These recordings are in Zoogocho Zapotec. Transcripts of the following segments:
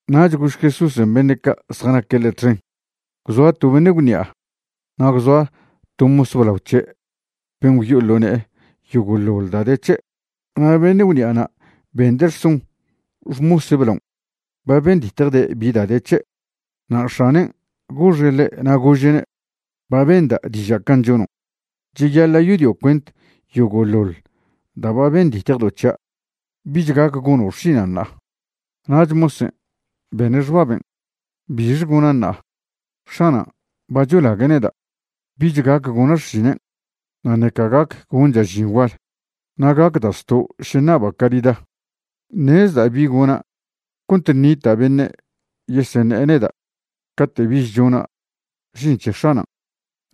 Nach gož Jesúsen' beṉe' ca' zjanaque' ḻe' txen: ―Gwzoa to beṉe' gwṉi'a na' gwzoa to mos blao c̱he' ben' gwyo'o ḻo ne'e yogo'ḻoḻ da' de c̱he'. Na' beṉe' gwṉi'ana' bende' rson xmose' blaon' ba benditjde' bi da' de c̱he'. Na' x̱anen' goxe' ḻe' na' gože'ne': “Ba benda' diža' can' chonon'. Cheyaḻa' yodio' cuent yogo'ḻoḻ da' ba benditjedo' c̱hia'. Bich gac gono' xšinan' ṉa'a.” Nach mosen' bene' xbaben': “¿Bixe gona' ṉa'a? X̱anan' ba cholague' neda'. Bich gac gona' xšinen', na' ṉeca gac goncha' žin gual, na' gacda' zto' še ṉaba' carida. Ṉezda' bi gona' cont ṉita' beṉe' yeseṉe'e neda' cate' bich chona' žin c̱he x̱anan'.”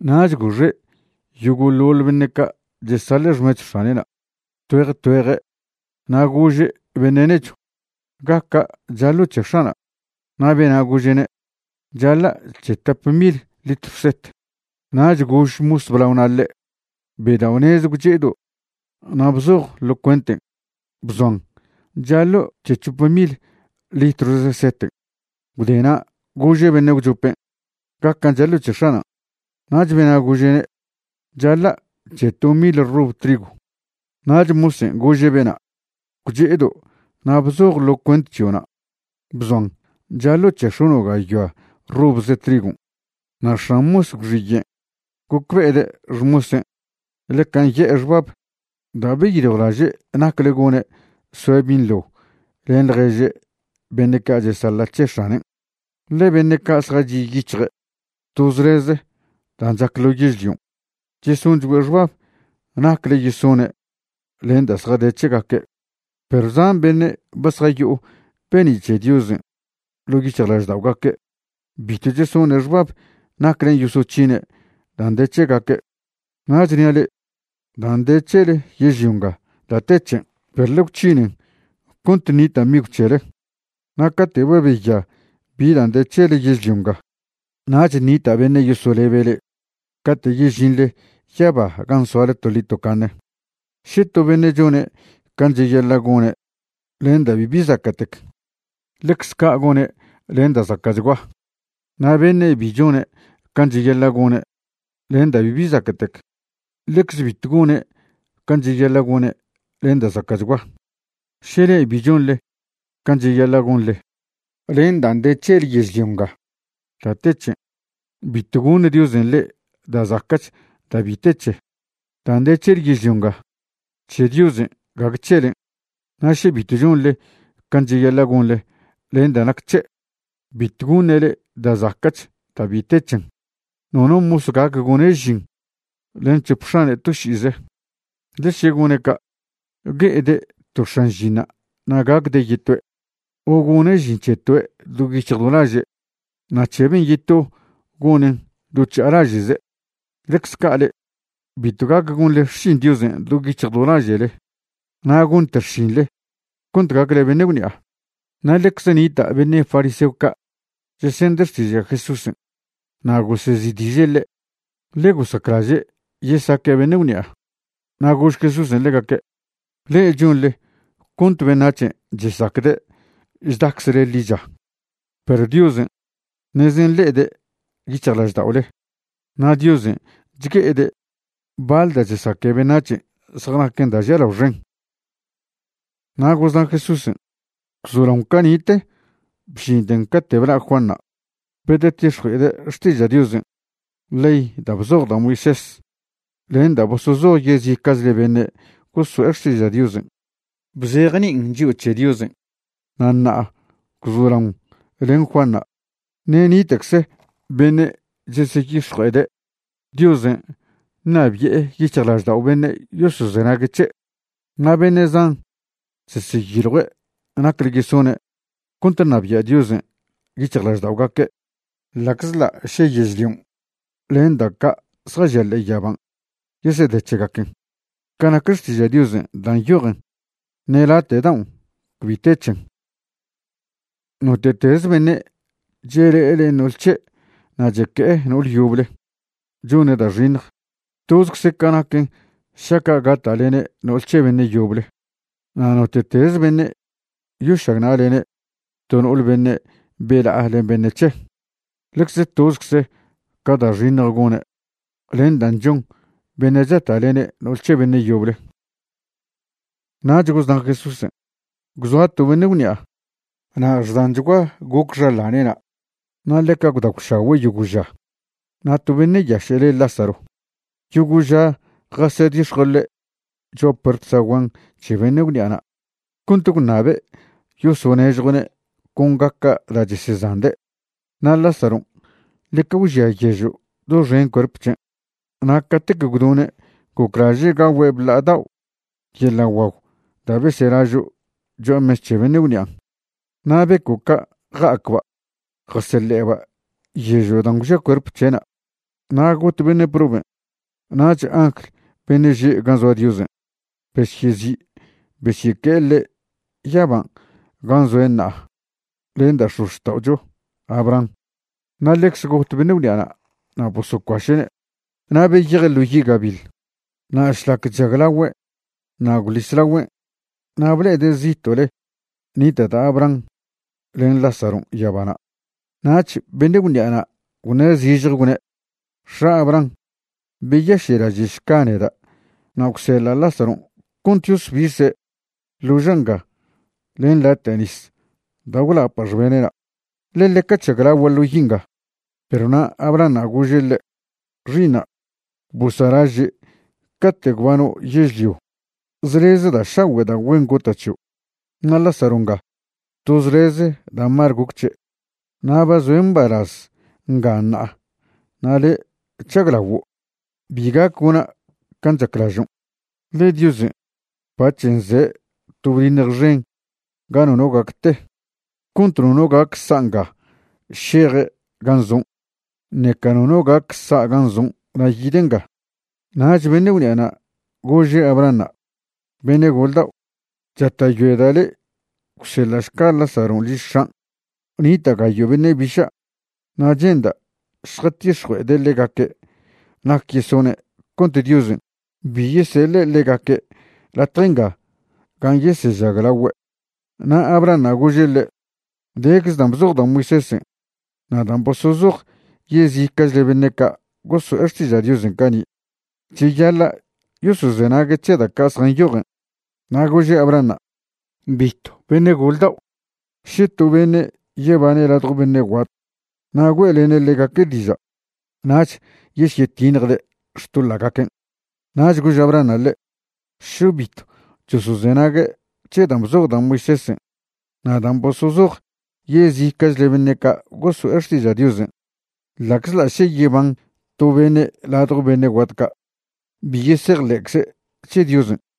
Nach goxe' yogo'ḻoḻ beṉe' ca' chesaḻa' xmechw x̱ane'na' tgüej tgüeje' na' gože' beṉe' nechw: “¿Gaca' chaḻo' c̱he x̱ana'?” Na' bena' gože'ne': “Chaḻa' c̱he tap mil litrw set.” Nach gož mos blaona' ḻe': “Bedao'nez gwche'edo' na' bzoj ḻo cuenten' bzoan chaḻo' c̱he c̱hop mil litrwze seten'.” Gwde na' gože' beṉe' gwchopen': “¿Gacan' chaḻo' c̱he x̱anan'?” Nach bena' gože'ne': “C̱haḻa' c̱he to mil rob trigw.” Nach mosen' gože' bena': “Gwche'edo' na' bzoj ḻo cuent c̱hio'na' bzoan chaḻo' c̱he x̱ono' gayoa robze trigon'.” Na' x̱an mos gwxiyen' gocbe'ede' xmosen' ḻeca nye'e xbab da' beyiljwlaže' nacle gone' soe' binḻo len ḻježe' beṉe' ca' chesaḻa' c̱he x̱anen'. Ḻe beṉe' ca' zjachi' yic̱hje' to zleze dan' chac ḻo yežlion' chesonchgüe' xbab nacle yesone' len dan' zjade c̱hegaque', perw zan beṉe' ba zjayo'o be'ni' c̱he Diosen' ḻo' yic̱hjlažda'ogaque' bitw chesone' xbab naclen' yosoc̱hine' dan' de c̱hegaque'. ’Na' chnia' le'e, dan' de c̱hele yežlio nga da' te c̱hen', perw ḻe gwc̱hinen cont ṉita' migw c̱hele. Na' cate' ba beya bi dan' de c̱hele yežlio nga, nach ṉita' beṉe' yosolebe' le'e cate' yežinḻe yaba gan' soale toḻi tocaṉe. ’Še to beṉe' chone' can' cheyaḻa' gone' len da' bibi zaca'tec, ḻecz ca' gone' len da' zaca'chgua. Na' beṉe' bi chone' can' cheyaḻa' gone' len da' bibi zaca'tec, ḻecz bitw gone' can' cheyaḻa' gone' len da' zaca'chgua. Še le'e bi chonḻe can' cheyaḻa' gonḻe len dan' de c̱hele yežlio nga da' te c̱hen', bitw goṉ Diosen' le'e da' zaca'ch da' bi te c̱he. Dan' de c̱hele yežlio nga, c̱he Diosen' gague c̱helen'. Na' še bitw chonḻe can' cheyaḻa' gonḻe len da' nac c̱he', bitw goṉe' le'e da' zaca'ch da' bi te c̱hen. ’Nono mos gac gone' žin len c̱hop x̱ane' to ši'ize, ḻe še gone' ca', gue'ede' to x̱an žinṉa' na' gacde' yetoe'; o gone' žin c̱he toe' do yic̱hj do laže' na' c̱he ben' yeto gonen' do chža'alaže'ze'. Ḻecze ca' le'e, bitw gac gonḻe xšin Diosen' do yic̱hj do laže'le na' gonte xšinḻe cont gacle beṉe' gwṉi'a. Na' ḻecze nita' beṉe' fariseo ca' chesende' xtiža' Jesúsen', na' gosezi'diže' ḻe', ḻe gosaclaže' yesaque' beṉe' gwṉi'a. Na' gož Jesúsen' ḻegaque': ―Le'e chonḻe cont beṉac̱hen' chesacde' chdaczle ḻicha, perw Diosen' ṉeze nle'ede' yic̱hjlažda'ole, na' Diosen' chgue'ede' baḻ da' chesaque beṉac̱hen' zjanaquen da' žialao xen. Na' gozna' Jesúsen': ―Gwzolaon cani'te bžinten cate' bla' Juanṉa' bedetix̱jue'ede' xtiža' Diosen', ley dan' bzoj da' Moisés len dan' bosozoj yezica'chle beṉe' gosoe' xtiža' Diosen' bzejni'in chio' c̱he Diosen'. Na' ṉa'a gwzolaon len Juanṉa', ṉe' nita'cze beṉe' cheseyix̱jue'ede' Diosen' ṉabi'e yic̱hjlaždao' beṉe' yosozenague' c̱he'. Na' beṉe' zan cheseyiljue' nacle yesone' cont ṉabia' Diosen' yic̱hjlažda'ogaque'. ’Ḻa'czḻa' še yežlion' len da' ca' zjažia ḻe'e yaban' yesede c̱hegaquen, ca nac Xtiža' Diosen' dan' nyojen, ṉe late' daon' cbi te c̱hen. ’Note'teze beṉe' chele'e len no'ol c̱he' na' cheque'e no'ole yoble chone' da' xiṉj, tozcze ca naquen šaca' gata'lene' no'ol c̱he beṉe' yoble. Na' note'teze beṉe' yošagna'lene' to no'ole beṉe' bela'a len beṉe' c̱he', ḻecze tozcze ca da' xiṉj gone' len dan' chon beṉe' chata'lene' no'ol c̱he beṉe' yoble. Nach gozna' Jesúsen': ―Gwzoa to beṉe' gwṉi'a na' xdanchgua goc xaḻane'na', na' ḻeca gwdagwšagüe' yogo' ža. Na' to beṉe' yaše' le' Lázaro, yogo' ža jasedix̱jue' ḻe' cho'a puert zaguan c̱he beṉe' gwṉi'ana' cont gwṉabe' yosonežjue'ne' con gaca' da' chesezande'. Na' Lázaron' ḻeca gwžia yežo' doxen cuerp c̱hen'. Na' catec gwdone' goclaže' gagüe' bla'a dao' yeḻa' guagw da' beselažo' cho'a mes c̱he beṉe' gwṉi'an'. Na' beco' ca' ja'acba' jaseḻe'eba' yežo' dan' gwžia cuerp c̱he'na'. Na' got beṉe' proben' nach angl beṉe' že' gan' zoa Diosen' besyezi' besyeque'e ḻe' yaban' gan' zoe' ṉa'a len da' x̱ozxta'ocho Abraham. Na' ḻecze got beṉe' gwṉi'ana' na' bosocuaše'ne' na' beyeje' ḻo yi' gabiḻ. Na' šlac chžaglagüe' na' gwḻis lagüen' na' ble'ede' zito'le nita' da' Abraham len Lázaron' yabana'. Nach beṉe' gwṉi'an' gwṉe' zižje gwne': “X̱a' Abraham, beyaše'laže'šca neda' na' gwseḻa' Lázaron' cont yosbise' ḻoža' nga len late' nis da' gwlapa' xbene'na', ḻe ḻeca chžaglagua' ḻo yi' nga.” Perw na' Abrahanṉa' gože' ḻe': “X̱i'iṉa', bosa'laže' cate' gwbano' yežlio zleze da' šagüe' da' güen gota' c̱hio', na' Lázaro nga to zleze da' mal goc c̱he'. Na' ba zoe' mbalaz nga ṉa'a na' le' chžaglaguo'. Bi gac gona' can' chaclažon', ḻe Diosen' bac̱h nze' to bdiṉj xen ga nono gac te, cont nono gac sa' nga šeje' gan' zon', ṉeca nono gac sa' gan' zon' na' yide' nga.” Nach beṉe' gwṉi'ana' gože' Abrahanṉa': “Beṉe' gol dao', chata'yoeda' le' gwseḻa'šca Lázaron' liž x̱an'. Nita' gayo' beṉe' biša' na' che'nda' šjatix̱jue'ede' ḻegaque' nac yesone' cont Diosen' bi yeseḻe' ḻegaque' latje nga gan' yesežaglagüe'.” Na' Abrahanṉa' gože' ḻe': “Decze dan' bzoj da' Moisésen' na' dan' bosozoj yezica'chle beṉe' ca' goso'e xtiža' Diosen' cani'. Cheyaḻa' yosozenague' c̱he da' ca' zjanyojen.” Na' gože' Abrahanṉa': “Bitw, beṉe' gol dao'. Še to beṉe' yebane' ladjo beṉe' guat na' güe'lene' ḻegaque' diža', nach yesyetiṉjde' xtoḻa'gaquen'.” Nach gož Abrahanṉa' ḻe': “Še bitw chosozenague' c̱he dan' bzoj da' Moisésen' na' dan' bosozoj yezica'chle beṉe' ca' goso'e xtiža' Diosen', ḻa'czḻa' še yeban to beṉe' ladjo beṉe' guat ca', bi yesejḻe'cze' c̱he Diosen'.”